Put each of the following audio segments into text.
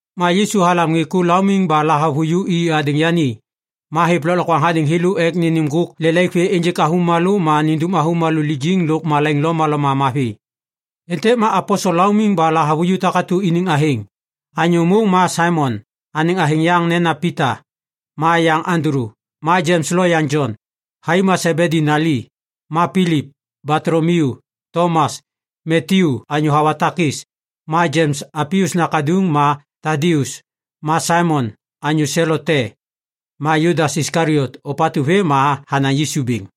Ma Yisu halam ŋê ku laumiŋ ba lahavuju i hadêŋ yani. Ma hêv lôklokwaŋ hadêŋ thêlô ek nênêm ŋgôk lelaik vê ênjêk avômalô ma nindum avômalô lijiŋ lôk malaiŋ lomaloma mavi. Êntêk ma aposel laumiŋ ba lahavuju takatu iniŋ athêŋ: anyô môŋ ma Saimon, anêŋ athêŋ yaŋ nena Pita, ma yaŋ Andulu; ma Jems loyaŋ Jon, thai ma Sebedi nali; ma Pilip, Batolomiu, Tomas, Matyu, anyô hawa takis; ma Jems Alpius nakaduŋ ma Tadius, ma Saimon, anyô Selot te, ma Judas Iskaliot, ôpatu vêm ma hanaŋ Yisu bêŋ.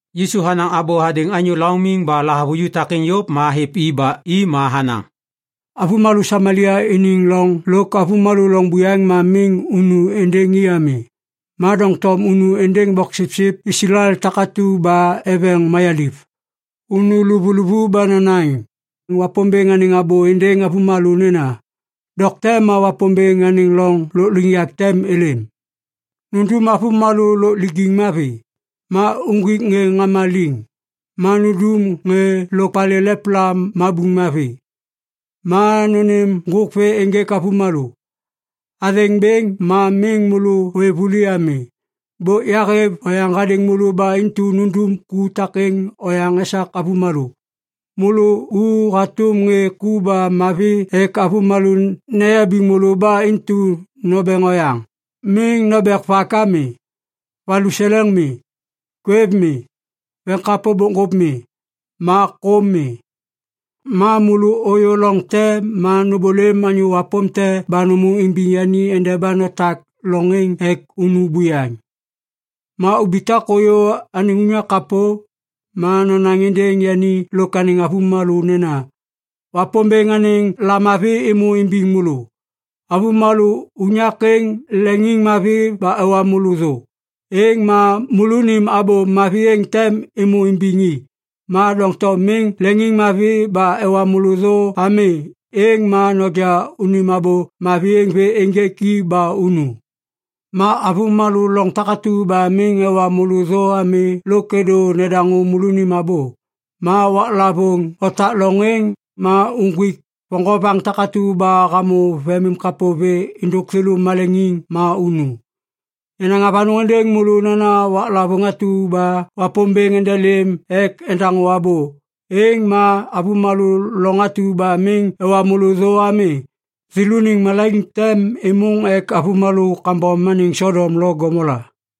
Yisu hanaŋ abô hadêŋ anyô laumiŋ ba lahavuju takêŋ yôv ma hêv i ba i ma hanaŋ, “Avômalô Samalia iniŋ loŋ lôk avômalô loŋ buyaŋ ma miŋ unu êndêŋ i ami. Ma doŋtom unu êndêŋ boksipsip Islael takatu ba eveŋ mayaliv. Unu luvuluvu ba nonaŋ Wapômbêŋ anêŋ abô êndêŋ avômalô nena, ‘Dokte ma Wapômbêŋ anêŋ loŋ lôkliŋyak tem êlêm.’ Nundum avômalô lôk lijiŋ mavi, ma uŋgwik ŋê ŋama liŋ, ma nundum ŋê lôk palê lepla mabuŋ mavi, ma nônêm ŋgôk vê ênjêk avômalô. Athêŋ bêŋ ma miŋ môlô ôêv vuli ami. Bôk yahêv oyaŋ hadêŋ môlô ba intu nundum ku takêŋ oyaŋ esak avômalô. “Môlô u hatôm ŋê ku ba mavi ek avômalô neyabiŋ môlô ba intu nombeŋ oyaŋ. Miŋ nobek vak ami. Valuseleŋ mi. Kwêv mi. Veŋ bokŋgôp mi. Ma kôm mi. Ma môlô ôyô loŋ te ma nômbôlêm anyô wapôm te ba nômô imbiŋ yani endeba notak loŋ êŋ ek unu buyaŋ. Ma ubitak ôyô anêŋ unyak kapô, ma nonaŋ êndêŋ yani lôk anêŋ avômalô nena, ‘Wapômbêŋ anêŋ lamavi êmô imbiŋ môlô.’ Avômalô unyak êŋ leŋiŋmavi ba ewa môlô thô, êŋ ma môlônim abô mavi êŋ tem êmô imbiŋ i. Ma doŋtom miŋ leŋiŋmavi ba ewa môlô thô ami, êŋ ma noja unim abô mavi êŋ vê ênjêk i ba unu. Ma avômalô loŋ takatu ba miŋ ewa môlô thô ami lôk êdô nedaŋô môlônim abô, ma waklavôŋ otak loŋ êŋ, ma uŋgwik voŋgovaŋ takatu ba hamô vemimkapô vê êndôk thêlô maleŋiŋ ma unu. Yanaŋ avanôŋ êndêŋ môlô nena waklavôŋ atu ba Wapômbêŋ endelêm ek endaŋô abô, êŋ ma avômalô loŋ atu ba miŋ ewa môlô thô ami, thêlôniŋ malaiŋ tem êmôŋ ek avômalô kambom anêŋ Sodom lo Gomola.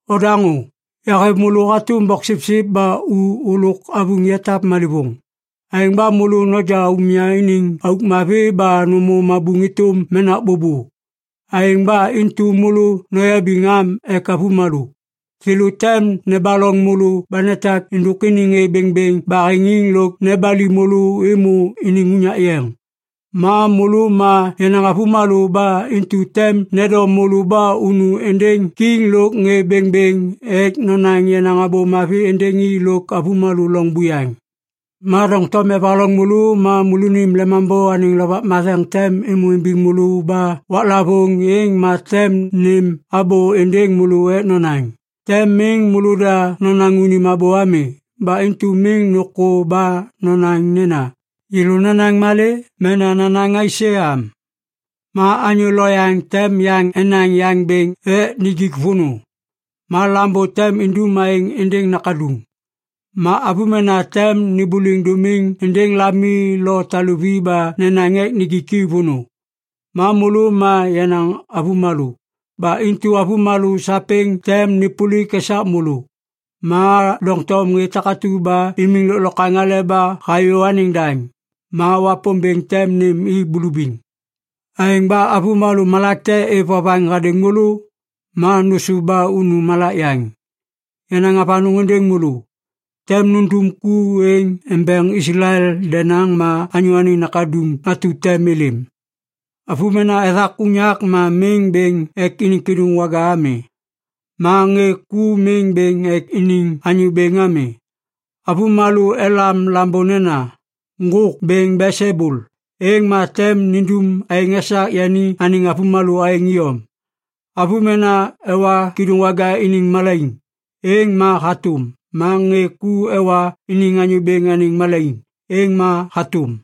“Odaŋô! Yahêv môlô hatôm boksipsip ba u ôlôk avuŋ yatap malêvôŋ. Aêŋ ba môlô noja umya iniŋ auk mavi ba nômô mabuŋ êtôm menak bôbô. Aêŋ ba intu môlô noyabiŋ am ek avômalô! Thêlô tem nebaloŋ môlô ba netak êndôk iniŋ ŋê bêŋbêŋ baheŋiŋ lôk nebali môlô êmô iniŋ unyak yeŋ. Ma môlô ma yenaŋ avômalô ba intu tem nendom môlô ba unu êndêŋ kiŋ lôk ŋê bêŋbêŋ ek nonaŋ yenaŋ Abô Mavi êndêŋ i lôk avômalô loŋ buyaŋ. Ma doŋtom evaloŋ môlô ma môlônim Lemambô anêŋ Lovak Matheŋ tem êmô imbiŋ môlô ba waklavôŋ êŋ ma tem nêm abô êndêŋ môlô ek nonaŋ. Tem miŋ môlôda nonaŋ unim abô ami. Ba intu miŋ nôkô ba nonaŋ nena, ‘Yêlô nanaŋ malê?’ mena ‘nanaŋ aisê?’ ami. “Ma anyô loyaŋ tem yaŋ enaŋ yaŋ bêŋ ek nijik vônô. Ma lambô tem indum aêŋ êndêŋ nakaduŋ. Ma avômena tem nêmbôliŋ dômiŋ êndêŋ lami lo taluvi ba nenaŋ ek nijik i vônô. Ma môlô ma yenaŋ avômalô. Ba intu avômalô sapêŋ tem nêpôlik esak môlô. Ma doŋtom ŋê takatu ba imiŋ lôklokwaŋ aleba hayô anêŋ daŋ, ma Wapômbêŋ tem nêm i bulubiŋ. Aêŋ ba avômalô malak te êv vovaŋ hadêŋ môlô, ma nôsôv ba unu malak yaŋ. Yanaŋ avanôŋ êndêŋ môlô, tem nundum ku êŋ embeŋ Islael denaŋ ma Anyô Anêŋ Nakaduŋ atu tem êlêm. “Avômena ethak unyak ma miŋ bêŋ ek iniŋ kêdôŋwaga ami. Ma ŋê ku miŋ bêŋ ek iniŋ anyô bêŋ ami. Avômalô elam lambô nena, ‘Ŋgôk Bêŋ Belsebul’ êŋ ma tem nindum aêŋ esak yani anêŋ avômalô aêŋ iyom. Avômena ewa kêdôŋwaga iniŋ malaiŋ, êŋ ma hatôm. Ma ŋê ku ewa iniŋ anyô bêŋ anêŋ malaiŋ, êŋ ma hatôm.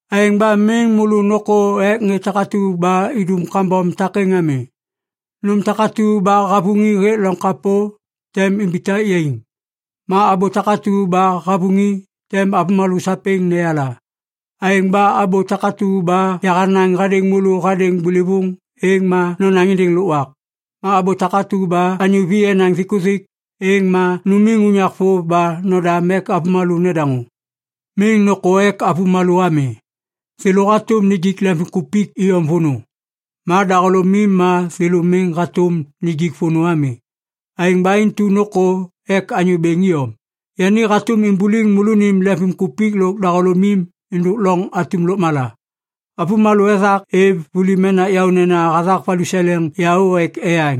“Aêŋ ba miŋ môlô nôkô ek ŋê takatu ba idum kambom takêŋ ami. Nôm takatu ba havuŋi hêk loŋ kapô, tem imbitak yaiŋ. Ma abô takatu ba havuŋi, tem avômalô sapêŋ neyala. Aêŋ ba abô takatu ba yahanaŋ hadêŋ môlô hadêŋ bôlôvôŋ, êŋ ma nonaŋ êndêŋ lôkwak. Ma abô takatu ba anyô vi enaŋ thikuthik, êŋ ma numiŋ unyak vôv ba nodam ek avômalô nedaŋô. Miŋ nôkô ek avômalô ami. Thêlô hatôm nijik lemvimkupik iyom vônô. Ma dahôlômim ma thêlô miŋ hatôm nijik vônô ami. Aêŋ ba intu nôkô ek Anyô Bêŋ iyom! Yani hatôm imbuliŋ môlônim lemvimkupik lôk dahôlômim êndôk loŋ atum lôkmala. “Avômalô ethak êv vuli menak yaônena hathak valuseleŋ yaô ek eyaŋ.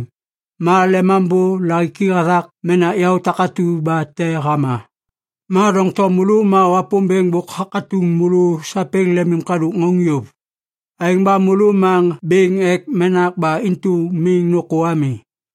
Ma Lemambô lahiki hathak menak yaô takatu ba te hama. Ma doŋtom môlô ma Wapômbêŋ bôk hakatuŋ môlô sapêŋ lemimkadôk ŋauŋ yôv. Aêŋ ba môlô ma bêŋ ek menak, ba intu miŋ nôkô ami.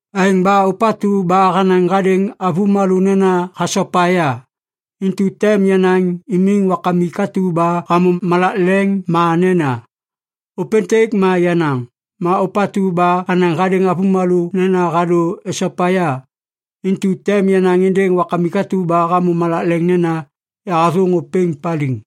“Aêŋ ba ôpatu ba hanaŋ hadêŋ avômalô nena hasopa ya, intu tem yanaŋ imiŋ Wakamik atu ba hamô malak leŋ ma nena, ‘Ôpêntêk ma yenaŋ.’ Ma ôpatu ba hanaŋ hadêŋ avômalô nena hadô esopa ya, intu tem yanaŋ êndêŋ Wakamik atu ba hamô malak leŋ nena, ‘Yahathôŋ ôpêŋ paliŋ.’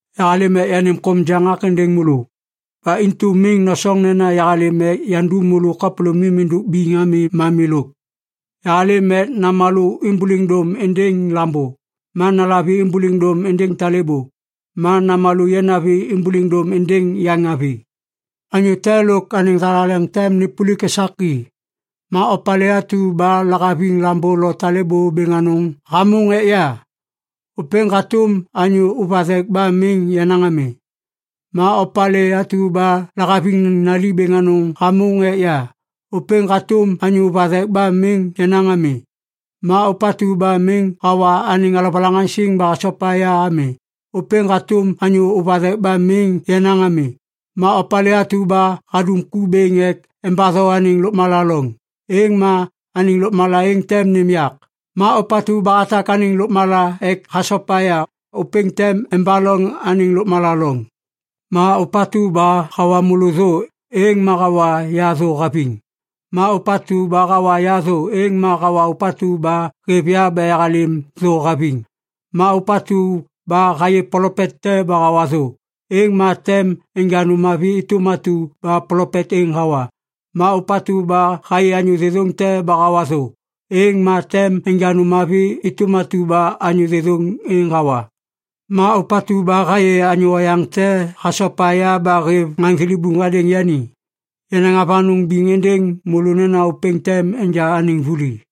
“Yahalêm ek yanêm kôm jaŋak êndêŋ môlô! Ba intu miŋ nosoŋ nena yahalêm ek yandum môlô kapôlômim êndôk biŋ ami ma milôk. Yahalêm ek “‘namalô êmbôliŋ dôm êndêŋ lambô, ma nalavi êmbôliŋ dôm êndêŋ talêbô, ma namalô yanavi êmbôliŋ dôm êndêŋ yaŋavi. Anyô te lôk anêŋ thalaleŋ tem nêpôlik esak i.’ “Ma opalê atu ba lahaviŋ lambô lo talêbô bêŋ anôŋ hamôŋ ek ya, ôpêŋ hatôm anyô ôv vathek ba miŋ yenaŋ ami. Ma opalê atu ba lahaviŋ nali bêŋ anôŋ hamôŋ ek ya, ôpêŋ hatôm anyô ôv vathek ba miŋ yenaŋ ami. Ma ôpatu ba miŋ hawa anêŋ alovalaŋaŋsiŋ ba hasopa ya ami, ôpêŋ hatôm anyô ôv vathek ba miŋ yenaŋ ami. Ma opalê atu ba hadum ku bêŋ ek embatho anêŋ lôkmala loŋ, êŋ ma anêŋ lôkmala êŋ tem nêm yak. Ma ôpatu ba hatak anêŋ lôkmala ek hasopa ya, ôpêŋ tem embaloŋ anêŋ lôkmala loŋ. “Ma ôpatu ba hawa môlô thô, êŋ ma hawa ya thô haviŋ. Ma ôpatu ba hawa ya thô, êŋ ma hawa Ôpatu ba hêv ya ba yahalêm thô haviŋ. Ma ôpatu ba hayê plopet te ba hawa thô, êŋ ma tem enja nôm mavi êtôm atu ba plopet êŋ hawa. Ma ôpatu ba hayê anyô thêthôŋ te ba hawa thô, êŋ ma tem enja nôm mavi êtôm atu ba anyô thêthôŋ êŋ hawa. Ma ôpatu ba hayê anyô oyaŋ te hasopa ya ba hêv ŋaŋ thilibuŋ hadêŋ yani, yanaŋ avanôŋ biŋ êndêŋ môlô nena ôpêŋ tem enja anêŋ vuli.”